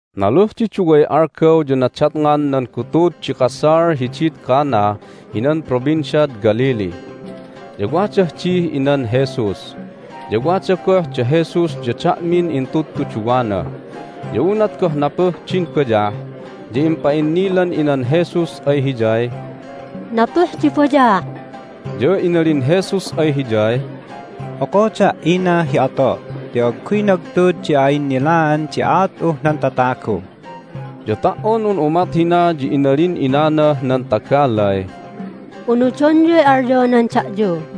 Naluh di duway algaw ya nadatngan nan gutud di kasal hidid Cana hinan Provinciad Galilee. Ya wadah dih inan Jesus, ya wada goh da Jesus ya da'min intudtuduwana. Ya unat goh napuh din bayah ya impa'innilan inan Jesus ay Hiyay, "Napuh di bayah!" Ya inalin Jesus ay hiyay, "Okoda', ina hi ato' ti agguy nagtud di a'innilaan di aat'uh nan tatagu." Ya ta"on un umat hina ya inalin inanah nan tagalay, "Unudonyuy alyonan da'yu."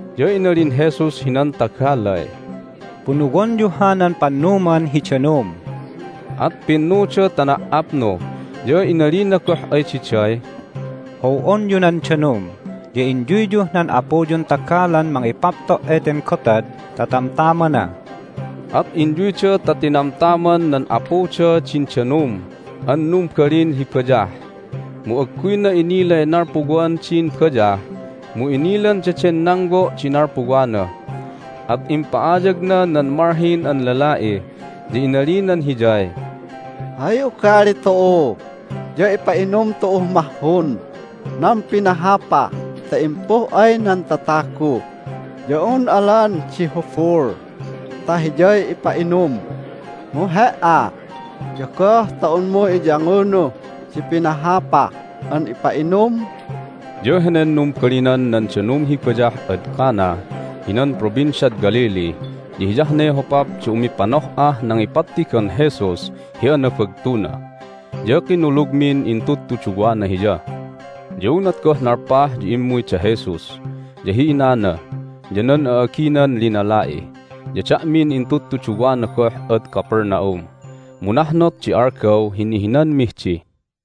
Ya inalin Jesus hinan tagalay, "Punuwonyu hanan pannuman hi danum." At pinnuda ta na"apnu. Ya inalina goh ay diday, "How'onyu nan danum, ya inyuyyuh nan apuyun tagalan mangipapto' eten gotad ta tamtamana." At inyuyda ta tinamtam nan apuda din danum an numbalin hi bayah, mu agguyna inilay nalpuwan din bayah, mu inilan daden nangwo' di nalpuwana. At impa'ayagna nan malhin an lala'i, ya inalinan hiyay, "Hay ugali tu'u ya ipa'inum tu'uh mahhun nan pinahapah ta impuh ay nan tatagu ya un alan di hubul ta hiyay ipa'inum. Mu he"a ya goh ta unmu iyangunuh di pinahapah an ipa'inum?" Ya henen numbalinan nan danum hi bayah ad Cana hinan Provinciad Galilee ya hiyah ne hopap di umipanoh'ah nangipattigan Jesus hi anabagtuna, ya kinulugmin intudtuduwana Hiya. Ya unat goh nalpah ya immuy da Jesus, ya hi inana, ya nan a'aginan linala'i, ya da'min intudtuduwana goh ad Capernaum, mu nahnot di algaw hi nihinanmih di.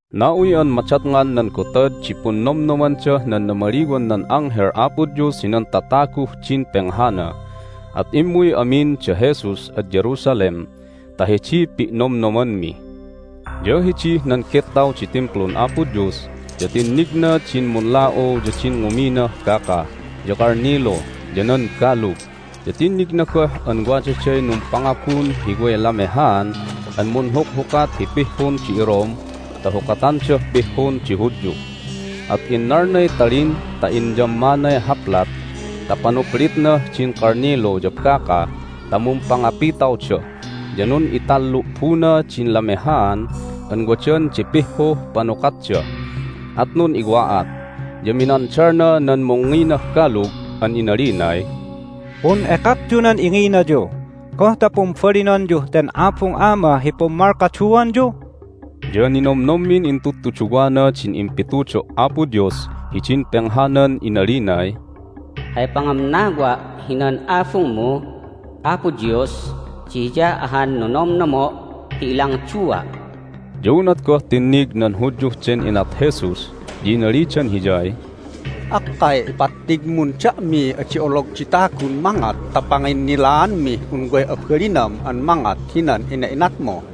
Na'uy an madatngan nan Gotad di Punnomnomandah nan Namaliwan nan Anghel Apo Dios hinan Tataguh din Penghana, at immuy amin da Jesus ad Jerusalem ta hidiy pi'nomnomanmi. Ya hidih nan gettaw di Timplun Apo Dios ya tinnigna din munla'u ya din nguminah baka, ya kalnilu, ya nan balug, ya tinnigna goh an wadaday numpangabun hi way lamehaan an munhukhukat hi pihhun di iRome ta hukatandah pihhun di Hudyu. At innalnay talin ta inyammanay haplat ta panuplitnah din kalnilu ya baka ta mumpangapitawda. Ya nun'itallu'buna din lamehaan an wadan di pihhuh panukatda, at nun'iwa'at. Ya minandalna nan mungnginah balug an inalinay, "Pun'ekakyu nan inginayu! Goh ta pumbalinonyuh ten Abung Ama hi pummalkaduanyu?" Ya ninomnommin intudtuduwana din impitudo' Apo Dios hidin penghanan inalinay, "Hay pangamnawa' hinan Abungmu, Apo Dios, di hiya ahan nonomnomo' hi ilangdua'." Ya unat goh tinnig nan Hudyuh den inat Jesus ya inalidan Hiyay, "Akkay ipattigmun da'miy adi olog di tagun mangat ta panginnilaanmih un way abalinam an mangat hinan ina'inatmu!"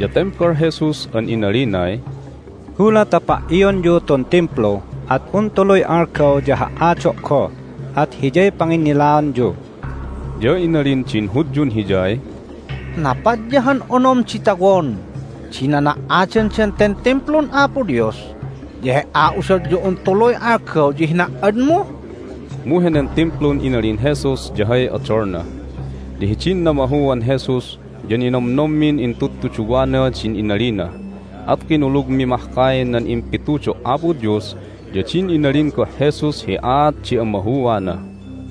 Ya tembal Jesus an inalinay, "Gulat ta pa"ionyu tun Timplu at un tuluy algaw ya ha"ado' goh, at hiyay panginnilaanyu." Ya inalin din Hudyun Hiyay, "Napat ya han onom di tawon di nana"adandan ten Timplun Apo Dios, ya He"a udot ya un tuluy algaw ya hina"admu?" Mu henen Timplun inalin Jesus ya hay odolna. Ya hidin namahuan Jesus ya ninomnommin intudtuduwana din inalina, at kinulugmi mahkay nan impitudo' Apo Dios ya din inalin goh Jesus hi aat di amahuana.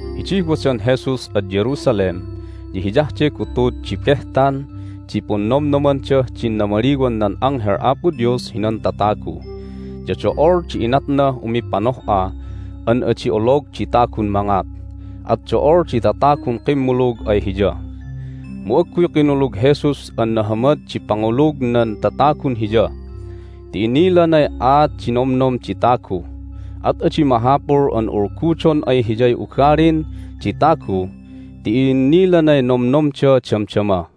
Hidih wadan Jesus ad Jerusalem ya hiyah de gutud di Behtan di Punnomnomandah din Namaliwan nan Anghel Apo Dios hinan Tatagu, ya do'ol di inatnah umipanoh'a an adi olog di tagun mangat, at do'ol di tatagun kimmulug ay Hiya. Mu agguy kinulug Jesus an nahamad di pangulug nan tatagun Hiya ti inilanay aat di nomnom di tagu. At adi mahapul an ulgudon ay Hiyay ugalin di tagu ti i'innilanay nomnomda damdama.